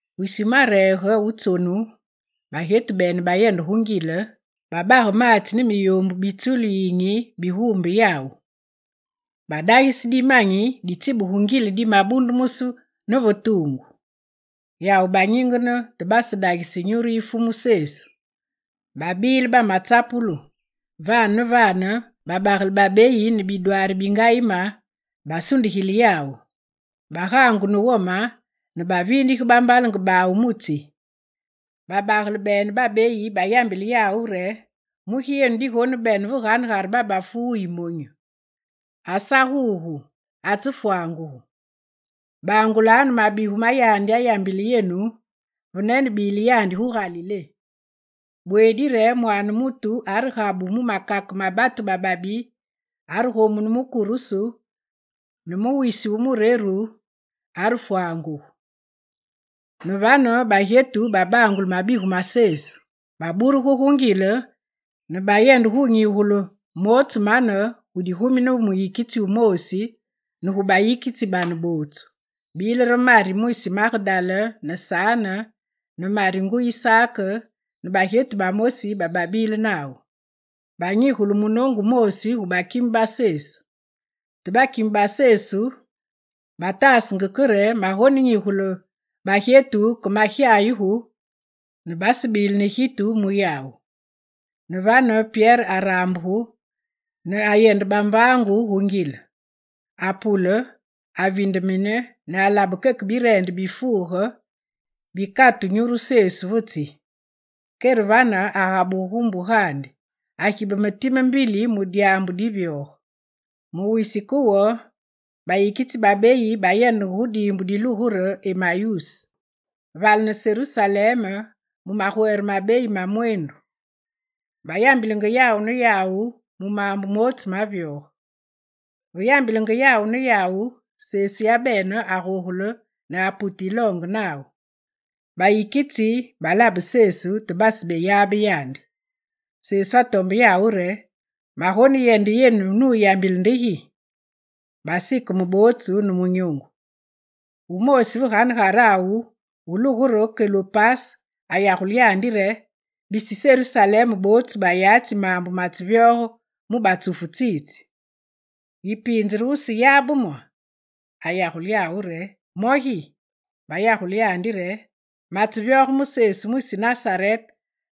Wisi wumareege wu tsonu, bagyetu bene bayende gu ngile, babage maatsi ne miyoombu bi tsulu yiyinyi biguumbe yawu. Badagise dimanyi ditsibugu ngile dimabundumusu ne ve tuungu. Yawu banyingene, te basedagise nyuru yi Fumu Sesu. Babile bamatsapulu. Vane ne vane babagele babeyi ne bidwaari bingayime basundigile yawu. Bagaangu ne wome ne baviindige bambalenge bawu mu tsi; babagele bene babeyi bayambile yawu re: «Mugi yenu digonebene ve ganegare babafu wuyi monyu? Asa gugu, atsefwangugu. Bangulanu mabigu mayambile yandi yenu ve nenebile yandi gu Galilé: “Bweedi re Mwaane mutu aregabu mu makake ma batu bababi, aregomunu mu kurusu ne mu wisi wu mureru, agufwanguge.”» Ne vane, bagyetu babangule mabigu ma Sesu. Baburugu gu ngile ne bayende nyigule mootsu mane gu digumi ne muyikitsi wumoosi ne gu bayikitsi bane bootsu. Bile re Mari mwisi Magedala ne Sane ne Mari nguyi Sak ne bagyetu bamosi bababile nawu. Banyigule munoongu wumoosi gu bakime ba Sesu. Te bakime ba Sesu bataasenge ke re magoneyambile bagyetu ke magyayugu ne basebile ne gitu mu yawu. Ne vane Pyere araambugu ne ayende bambaangu gu ngile. Apule, avindeme ne alabe keke bireende bifuuge bikatu nyuru Sesu ve tsi. Kere vane, agabugu gu mbugandi, agibeme time mbili mu dyaambu divyoge. Mu wisi ke wo, bayikitsi babeyi bayendenge gu diimbu dilugu re Emayuse, vale ne Serusalem mu magwere mabeyi ma mweendu. Bayambilenge yawu ne yawu mu maambu mootsu mavyoge. Ve yambilenge yawu ne yawu, Sesu yabene agogule ne apute yiloonge nawu. Bayikitsi balabe Sesu, te basebeyabe yandi. Sesu atombe yawu re: «Magoneyende yenu nuyambile nde gi?» Basikeme bootsu ne munyoongu. Wumoosi ve ganegarawu wulugu re Kelopase ayagule yandi re: «Bisi Serusalem bootsu bayatsi maambu matsevyoge mu batsufu tsitsi! Ne yipiinze yiseyabe mo?» Ayagule yawu re: «Mo gi?» Bayagule yandi re: «Matsevyoge mu Sesu mwisi Nasarete,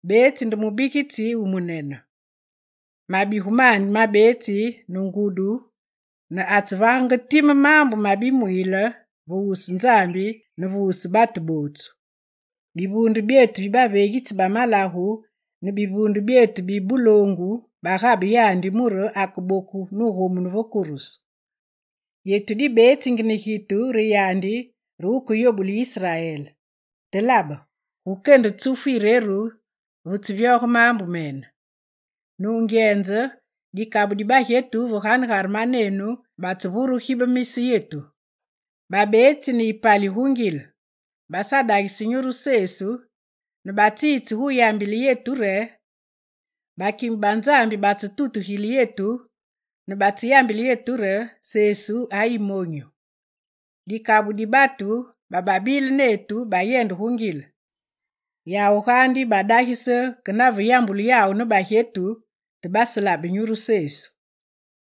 beetsi nde mubigitsi wumunene. Mabigu mandi mabeetsi ne ngudi ne atsevagenge time maambu ma bimwiile ve wusu Nzambi ne ve wusu batu bootsu. Bivuunde byetu bi baveegitsi ba malagu ne bivuunde byetu bi buloongu bagabe yandi mure akeboku nugomunu ve kurusu. Yetu dibetsingi ne gitu re yandi re wukeyobule Israel. Te labe gukende tsufu yireru vetsevyoge maambu mene. Nungyenze, dikabu di bagyetu ve ganegare manenu batsevure gibemise yetu. Babeetsi ne gayipali gu ngile. Basadagise nyuru Sesu ne batsitse yambile yetu re: “Bakime ba Nzambi batsetutugile yetu ne batseyambile yetu re: Sesu ayimonyu!” Dikabu di batu bababile netu bayende gu ngile. Yawu gaandi badagise ke naveyambulu yawu ne bagyetu, te baselabe Sesu.»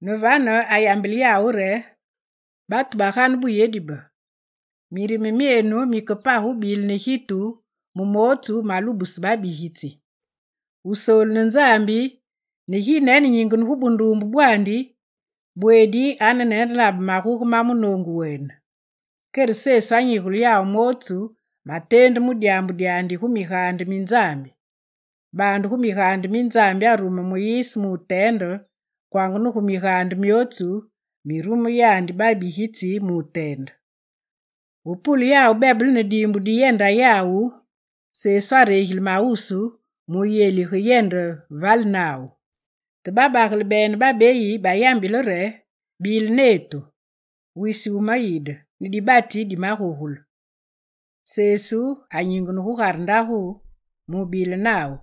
Ne vane ayambile yawu re: «Batu bagane buyedi be, mirime myenu mike page wubile ne gitu mu mootsu malubuse babigitsi! Wusoolu ne Nzambi ne ginene nyingene gu bunduumbe bwandi, bweedi arenenelabe maguge ma munoongu wene.» Kere Sesu anyigule yawu mootsu mateendu mu dyaambu dyandi, gu migaande mi Nzambi. Baande gu migaande mi Nzambi arume Muyise muteende, kwanga ne gu migaande myootsu mirume yandi babigitsi muteende. Ve pule yawu bebele ne diimbu diyenda yawu, Sesu aregile mawusu mu wuyelige yende vale nawu. Te babagele babeyi bayambile yandi re: «Bile netu! Wisi wumayide, ne dibati dimagogule.» Sesu anyingene gugare ndagu mubile nawu.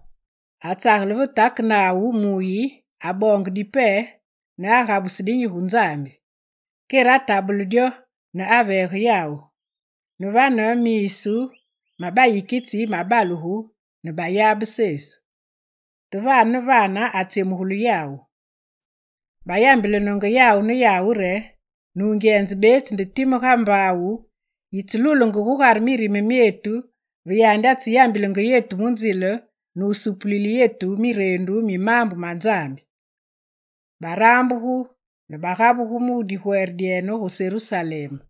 Atsagele ve take nawu mu wuyi, aboonge dipe nugabuse dinyi gu Nzambi. Kere atabule dyo ne wuveege yawu. Ne vane miisu ma bayikitsi mabalugu ne bayabe Sesu. Te vane ne vane, atsyemugile yawu. Bayambelenenge yawu ne yawu re: «Nungyenze, betsi time ga mbaawu yitselulenge gugare mirime myetu ve yandi atseyambilenge yetu mu nzile ne wusupulile yetu mireendu mi maambu ma Nzambi.» Baraambugu ne bagabugu mu digwere dyene gu Serusalem.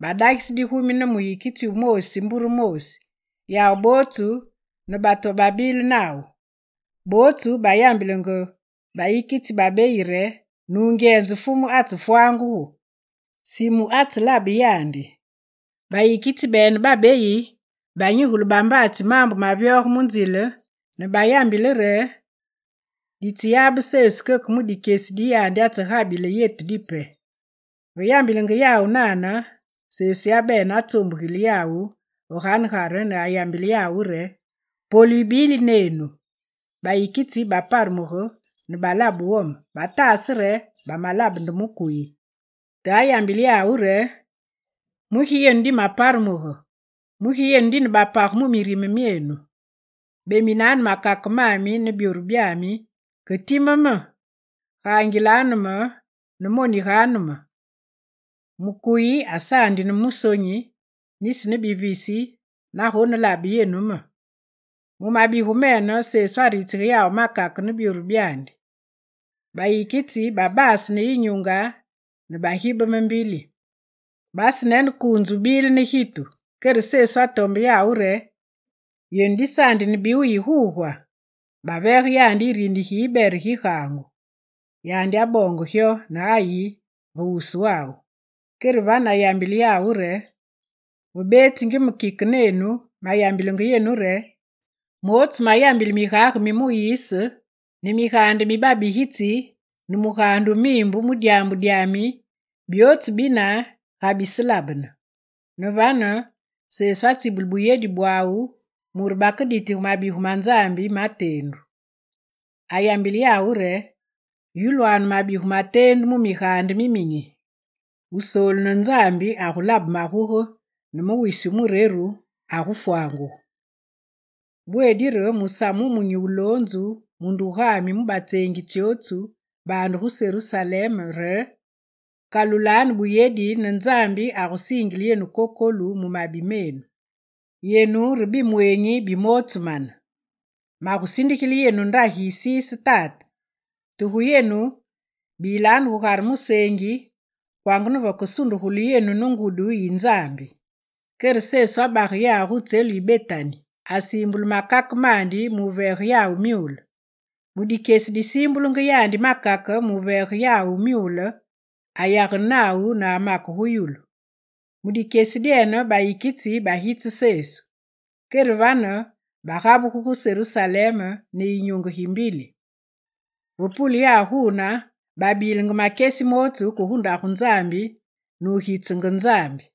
Badagise digumi ne muyikitsi wumoosi mbure moosi, yawu bootsu ne batu bababile nawu. Bootsu bayambile bayikitsi babeyi re: «Nungyenze, Fumu atsefwangugu! Simu atselabe yandi.» Bayikitsi babeyi banyigule bambaatsi maambu mavyoge mu nzile ne bayambile re: «Ditseyabe Sesu keke mu dikyesi di yandi atsegabile yetu dipe.» Ve yambilenge yawu nane, Sesu yabene atsoombugile yawu ve ganegare ne ayambile yawu re: «Polu yibili nenu!» Bayikitsi baparemugu ne balabe wome, bataase re bamalabe nde mukuyi. Te ayambile yawu re: «Mugi yenu dimaparemugu? Mugi yenu dine bapage mu mirime myenu? Beminanu makake mami ne byoru byami, ke time me! Gaangilanu me ne moniganu me! Mukuyi asaandi ne musonyi, nisi ne bivisi navegonelabe yenu me!» Mu mabigu mene, Sesu aritsige yawu makake ne byoru byandi. Bayikitsi babase ne yinyunge ne bagibeme mbili; basenenekuunze wubile ne gitu. Kere Sesu atombe yawu re: «Yenu disaandi ne biwuyi gugwa?» Baveege yandi yirini gi yibere gi gaangu. Yandi aboonge gyo ne ayi ve wuswawu. Kere vane ayambile yawu re: «Ve betsingi me kike nenu, mayambile yenu re: mootsu mayambile migage mi Muyise ne migaande mi babigitsi ne migaande mi Miimbu mu dyaambu dyami, byootsu bine gabiselabene.» Ne vane, Sesu atsibule buyedi bwawu mure bakeditige mabigu ma Nzambi, mateendu. Ayambile yawu re: «Yulwanu mabigu mateendu mu migaande miminyi: Wusoolu ne Nzambi agulabe maguge ne mu wisi wumureru, afwanguge. Bweedi re musamu wumunyi wuloonzu mu ndugami mu batseengi tsyotsu, baande gu Serusalem re: “Kalulanu buyedi ne Nzambi agusiingile yenu kokolu mu mabi menu!” Yenu re bimweenyi bi mootsu mane. Magusindigile yenu ndagi yisiise Tate, te gu yenu, bilanu gugare museengi, kwanga ne vekesundugulu yenu ne ngudi yi Nzambi.» Kere Sesu abage yawu gu tselu yi Betani. Asiimbule makake mandi muveege yawu myule. Mu dikyesi disiimbule yandi makake mu wuveege yawu myule, ayagene nawu ne amake gu yulu. Mu dikyesi dyene bayikitsi bagitse Sesu. Kere vane, bagabugu gu Serusalem ne yinyunge gi mbili. Ve pule yawu guune, babilenge makyesi mootsu ke gu ndagu Nzambi ne wugitsenge Nzambi.